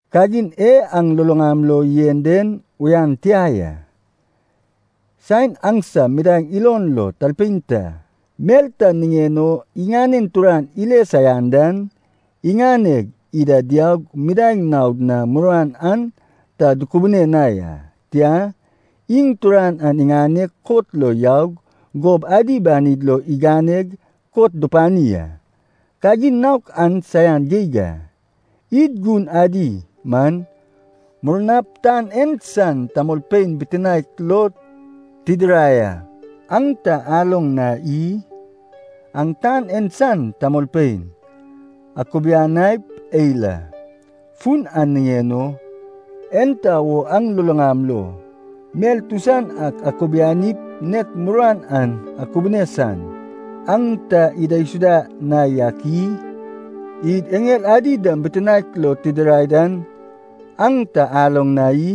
Kagin e aŋ luluŋam lo yen den uyan tia ya. Saen aŋsam midaeŋ ilon lo talpein ta mel ta niŋen o iŋanen turan ile saian dan, iŋaneg ida diaug midaeŋ naod na muruan an ta dukubune na ya. Tia, iŋ turan an iŋaneg kot lo yaug gob adi banid lo iganeg kot dupani a. Kagin naok an saian geig a. Id gun adi man, murnap tan en san tamolpein bitinaek lo tidirai a, an ta aloŋ na i? Aŋ tan en san tamolpein akubianaip eil a. Fun an niŋen o, enta wo aŋ luluŋam lo mel tusan ak akubianip nek muruan an akubune san, aŋ ta idaisuda na yak i? Id eŋel adi dam bitinaek lo tidirai an aŋ ta aloŋ na i?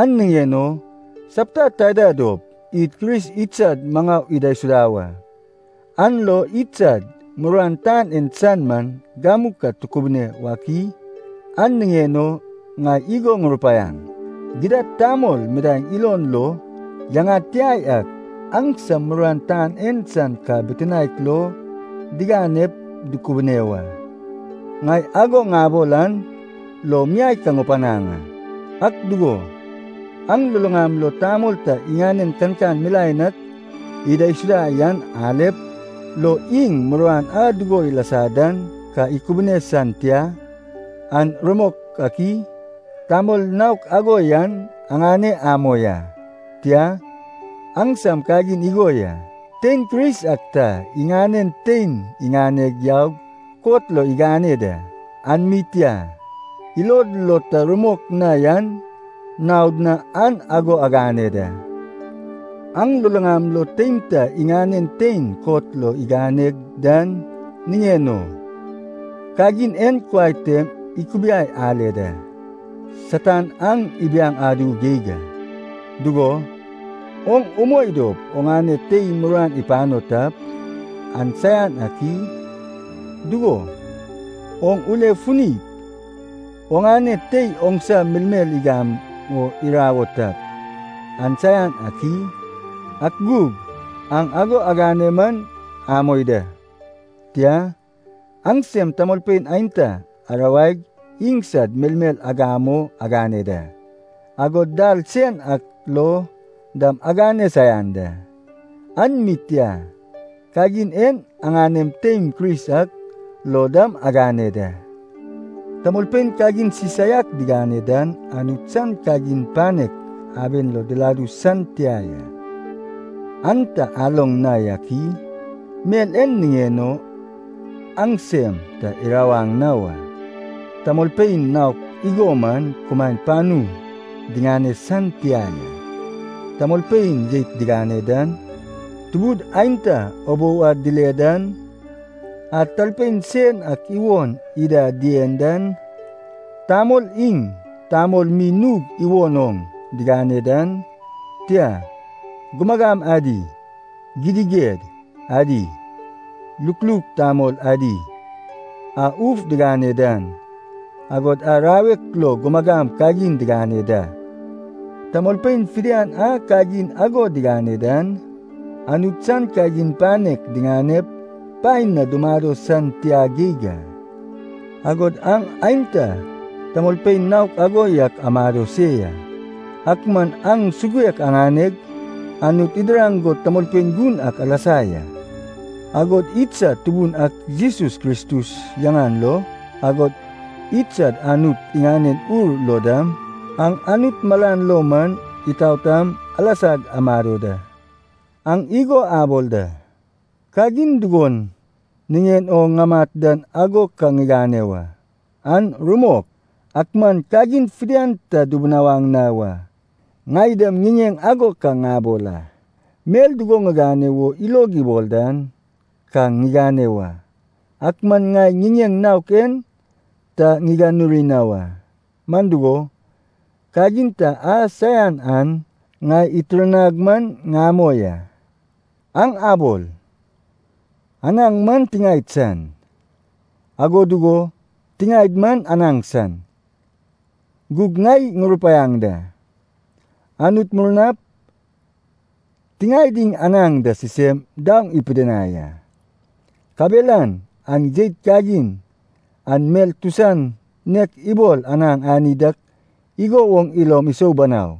An niŋen o sapta taida dop id Kris idsad maŋau idaisuda wa, an lo idsad muruan tan en san man gamu ka tukubune wak i? An niŋen o ŋai igo ŋurupaiaŋ, gidad tamol midaeŋ ilon lo yaŋad tia yak, aŋsam muruan tan en san ka bitinaek lo diganep dukubune wa. Ŋai ago ŋabol an lo miai ka ŋupanaŋ a. Ak dugo, aŋ luluŋam lo tamol ta iŋanen kankan milaen ak idaisuda yan alep, lo iŋ muruan a dugo ilasa dan ka ikubune san tia, an rumok ak i? Tamol naok ago yan aŋane amoi a, tia, aŋsam kagin igo ya. Tein Kris ak ta iŋanen tein iŋaneg yaug kot lo igane da. An mi tia, ilod lo ta rumok na yan naod na aŋ ago agane da! Aŋ luluŋam lo tein ta iŋanen tein kot lo igane dan niŋen o, kagin en kuai tem ikubiai ale da, Satan aŋ ibiaŋ adu geig a. Dugo, oŋ umoi dop oŋane tei muruan ipano tap, an saian ak i? Dugo, oŋ ule funip oŋane tei oŋsa melmel igam o irawo tap, an saian ak i? Ak gug aŋ ago agane man amoi da. Tia, aŋsem tamolpein aenta arawaig iŋsad melmel agam o agane da, agod dal sen ak lo dam agane saian da. An mi tia, kagin en aŋanem teim Kris ak lo dam agane da! Tamolpein kagin sisaiak digane dan Anut san kagin panek aben lo diladu san tia ya, an ta aloŋ na yak i? Mel en niŋen o aŋ sem ta irawaŋ na wa. Tamolpein naok igo man kumaen panu diŋane san tia ya: tamolpein jeit digane dan, tubud aenta ubou ad dile dan, a talpein sen ak iwon ida dien dan, tamol iŋ tamol mi nug iwon oŋ digane dan, tia, gumagam adi, gidiged adi, lukluk tamol adi, a uf digane dan, agod a rawek lo gumagam kagin digane da. Tamolpein fidian a kagin ago digane dan, Anut san kagin panek diŋanep paen na dumado san tia geig a. Agod aŋ aenta tamolpein naok ago yak amado se ya. Ak man aŋ suguek aŋaneg, Anut idiraŋ go tamolpein gun ak alasa ya. Agod idsad Tubun ak Jesus Kristus yaŋan lo, agod idsad Anut iŋanen Ur lo dam, aŋ Anut malan lo man itaotam alasag amado da. Aŋ igo abol da, “Kagin dugon niŋen o ŋamat dan ago ka ŋigane wa.” An rumok, ak man kagin fidian ta dubunawaŋ na wa. Ŋai dam ŋiŋeŋ ago ka ŋabol a, mel dugo ŋigane wo ilog ibol dan ka ŋigane wa. Ak man ŋai ŋiŋeŋ naok en ta ŋiganuri na wa, man dugo, kagin ta a saian an ŋai itirnag man ŋamoi a. Aŋ abol, “Anaŋ man tiŋaed san, ago dugo tiŋaed man anaŋ san.” Gug ŋai ŋurupaiaŋ da, Anut murnap tiŋaed iŋ anaŋ da sisem daoŋ ipidinai a. Kabelan aŋ jeit kagin an mel tusan nek ibol anaŋ ani dak igo woŋ ilom isou banau.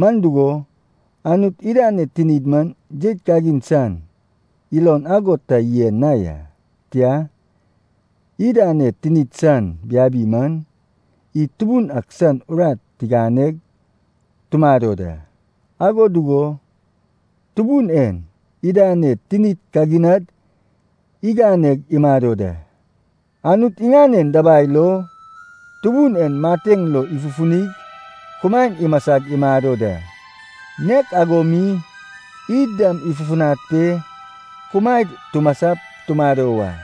Man dugo, Anut idaned tinid man jeit kagin san, ilon ago ta yen na ya, tia, idaned tinid san biabi man, id Tubun ak san urat tiganeg tumado da. Ago dugo Tubun en idaned tinid kaginad iganeg imado da. Anut iŋanen dabai lo Tubun en mateŋ lo ifufunig kumaen imasag imado da. Nek ago mi id dam ifufunad pe kumaed tumasap tumado wa.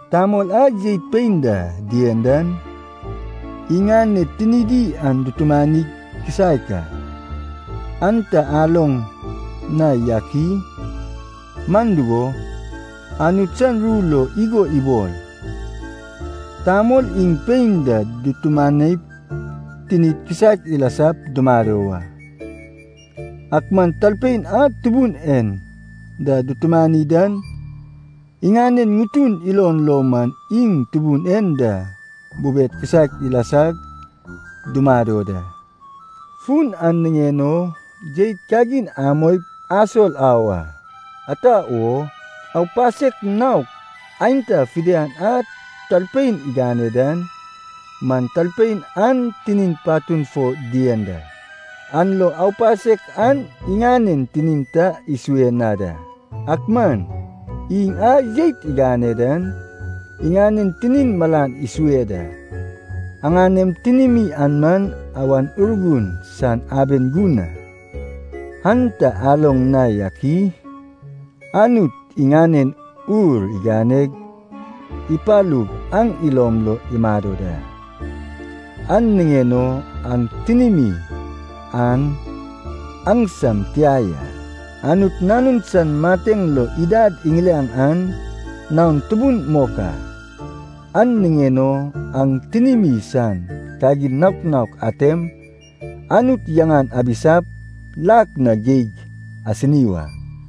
Tamol a jeit pein da dien dan, iŋaned tinidi an dutumanig kisaek a, an ta aloŋ na yak i? Man dugo, Anut san ru lo igo ibol, “Tamol iŋ pein da dutumanip tinid kisaek ilasap dumado wa.” Ak man talpein a Tubun en da dutumani dan, iŋanen ŋutun ilon lo man iŋ Tubun en da bubed kisaek ilasag dumado da. Fun an niŋen o jeit kagin amoip asol au a. Ata wo? Aupasek naok aenta fidian a talpein igane dan man talpein an tinin patun fo dien da, an lo aupasek an iŋanen tinin ta isue na da. Ak man iŋ a jeit igane dan iŋanen tinin malan isue da. Aŋanem tinimi an man Awan Urgun san aben gun a, an ta aloŋ na yak i? Anut iŋanen Ur iganeg ipalug aŋ ilom lo imado da, an niŋen o aŋ tinimi an aŋsam tia ya. Anut nanun san mateŋ lo idad iŋiliaŋ an naon tubun mok a, an niŋen o aŋ tinimi san kagin naok naok atem, Anut yaŋan abisap lak na geig asini wa.